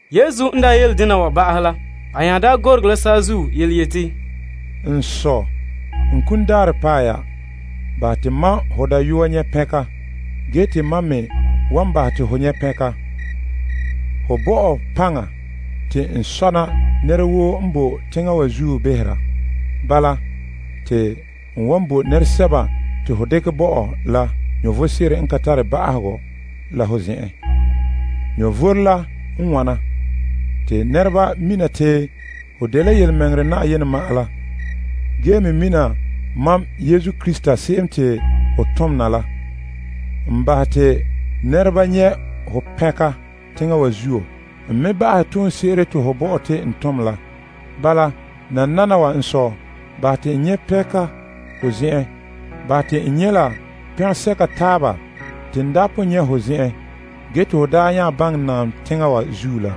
Yesu n daa ta yele dena wa ba'ahɛ la, a nya gorege la saazuo yeti, N Sɔ, saŋa la paɛ ya. Bahɛ te mam ho Dayɔa nyɛ' pɛnka ge te mam me wan bahɛ te ho nyɛ' pɛnka. Ho bo mam paŋa te n sɔna nɛra woo n boe teŋa wa zuo behera. Bala, te n wan bo nɛresɛba te ho dekɛ bo mam la vom sebo n ka tare ba'ahegɔ la ho zen'en. Vom la n wana: te nɛreba mina te ho dela yelemɛŋɛrɛ Na'ayenɛ ma'an la, ge me mina mam Yesu Krista se'em te ho tom na la. N bahɛ te nɛreba nyɛ' ho pɛnka teŋa wa zuo. N me ba'ahɛ toonse'ere te ho bo mam te n tom la. Bala, nananawa n Sɔ, bahɛ te n nyɛ' pɛnka ho zen'en. Bahɛ te n nyɛ' la pɛngɛsɛka taaba te n daa pon nyɛ' ho zen'en ge te ho daa nya baŋɛ naam teŋa wa zuo la.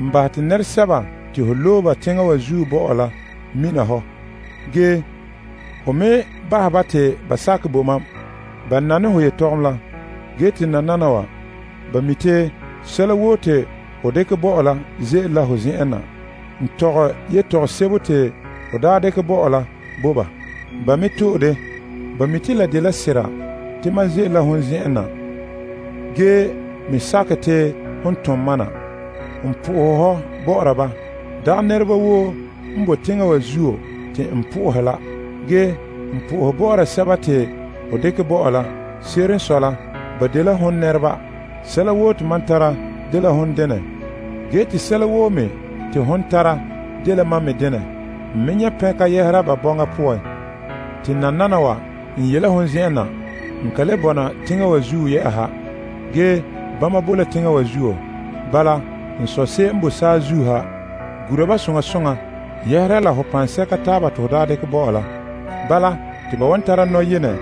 N bahɛ te nɛresɛba te ho loe ba teŋa wa zuo bo mam la mina hɔ. Ge, ho me bahɛ ba te ba sakɛ bo mam. Ba nane ho yelehom la, ge te nananawa, ba mi' te sɛla woo te ho dekɛ bo mam la ze'ele la hon zen'en na. N tɔgɛ yetɔgom sebo te ho daa dekɛ bo mam la bo ba. Ba me to'e de. Ba mi' te la dela sera te mam ze'ele la hon zen'en na ge me sakɛ te hon tom mam na. N po'ohɛ hɔ bɔ'ɔra ba. Dagɛ nɛreba woo n boe teŋa wa zuo te n po'ohɛ la. Ge, n po'ohɛ bɔ'ɔra sɛba te ho dekɛ bo mam la. Se'ere n sɔe la, ba dela hon nɛreba. Sɛla woo te mam tara dela hon denɛ, ge te sɛla woo me te hon tara dela mam me denɛ. N me nyɛ' pɛnka yɛhera ba bɔŋa poan. Te nananawa, n ye la hon zen'en na. N ka le bɔna teŋa wa zuo yɛ'ɛha. Ge, bama boe la teŋa wa zuo. Bala, fa'a Sɔ wa gura ba soŋa ho yu'urɛ paŋa la poan te ho daa dekɛ bo mam la. Bala, te ba wan tara nɔyene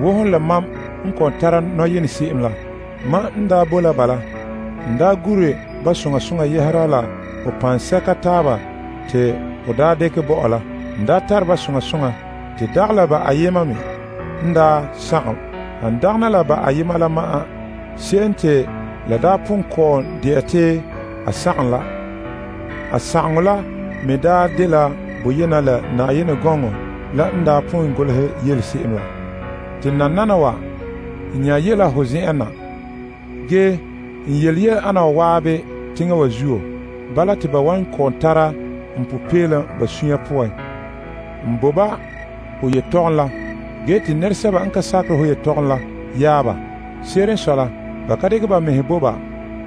wo hon la mam n kɔ'ɔn tara nɔyene se'em la. Mam n daa boe la ba la, n daa gure ba ho yu'urɛ paŋa la poan, yu'urɛ se'ere te ho daa dekɛ bo mam la. N daa tare ba soŋa soŋa te dagɛ la ba ayema me n daa sagom, han dagana la ba ayema la ma'an, se'em te la daa pon kɔ'ɔn de'a te a sagom la. A sagaŋɔ la me daa dela boyena la Yenɛ gɔŋɔ la n daa pon golehɛ yele se'em la. Te nananawa, n nya yele la ho zen'en na. Ge, n yele yele ana wa zan'an teŋa wa zuo. Bala, te ba wan kɔ'ɔn tara n popeelom ba sunya poan. N bo ba ho yetɔgɔm la ge te teŋa wa zuo yaɛ ba. Se'ere n sɔe la, ba ka dekɛ ba mɛhe bo ba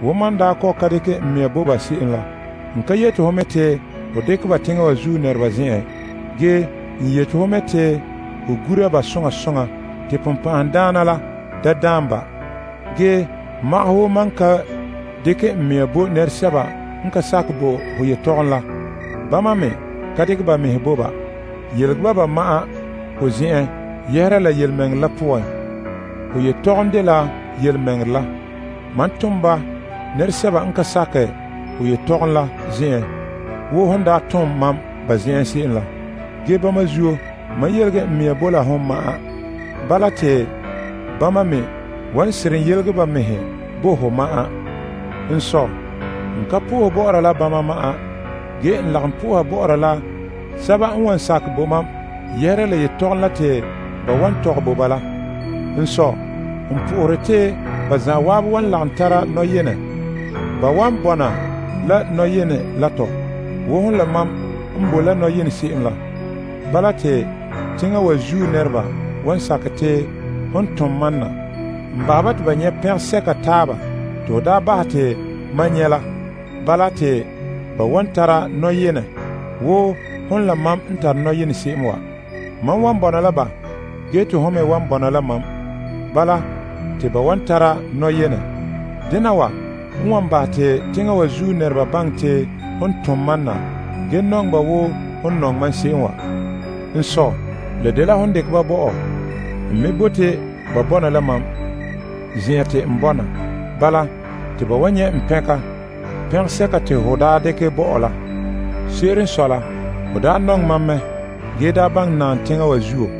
wo mam n daa kɔ'ɔn ka dekɛ n mea bo ba se'em la. N ka yeti ho mɛ te ho dekɛ ba teŋa wa zuo nɛreba zen'en. Ge, n yeti ho mɛ te ho gura ba soŋa soŋa te Dima la da daam ba. Ge magahɛ wo mam n ka dekɛ n mea bo teŋa wa zuo se'em la, bama me ka dekɛ ba mɛhe bo ka. Yelege ba ba ma'an ho zen'en yɛhera la yelemɛŋɛrɛ la poan. Ho yetɔgɔm dela yelemɛŋɛrɛ la. Mam tom ba la teŋa wa zuo wo hon daa tom mam ba zen'en se'em la. Ge bama zuo, mam yelege n mea bo la hon ma'an. Bala, te bama me wan seren yelege ba mɛhe bo ho ma'an. N Sɔ, n ka po'ohe bɔ'ɔra la bama ma'an. Ge, n lagom po'oha bɔ'ɔra la sɛba n wan sakɛ bo mam yɛhera la yetɔgɔm la te ba wan tɔgɛ bo ba la. N Sɔ, n po'ohere te ba zan'an wan lagom tara nɔyene. Ba wan bɔna la nɔyene la tɔ, wo hon la mam n bo la nɔyene se'em la. Bala, te teŋa wa zuo nɛreba wan sakɛ te hon n tom mam na. N bahɛ ba te ba nyɛ' pɛngɛsɛka taaba te ho daa bahɛ te mam nyɛ' la. Bala, te ba wan tara nɔyenɛ wo hon la mam n tare nɔyene se'em wa. Mam wan bɔna la ba ge te hon me wan bɔna la mam. Bala, te ba wan tara nɔyene. Dena wa n wan bahɛ te teŋa wa zuo nɛreba baŋɛ te hon tom mam na ge nɔŋɛ ba wo hon nɔŋɛ mam se'em wa. N Sɔ, la dela hon dekɛ ba bo mam. N me bote ba bɔna la mam, zen'an te n bɔna. Bala, te ba wan nyɛ' n pɛnka, pɛngɛsɛka te ho daa dekɛ bo mam la. Se'ere n sɔe la, ho daa nɔŋɛ mam mɛ ge daa baŋɛ naam teŋa wa zuo.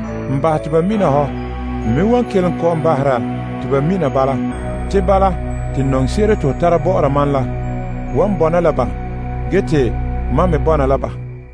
N bahɛ te ba mina hɔ. N me wan kelom kɔ'ɔn bahera te ba mina bala. Te bala te nɔŋse'ere te ho tara bɔ'ɔra mam la wan bɔna la ba ge te mam me bɔna la ba.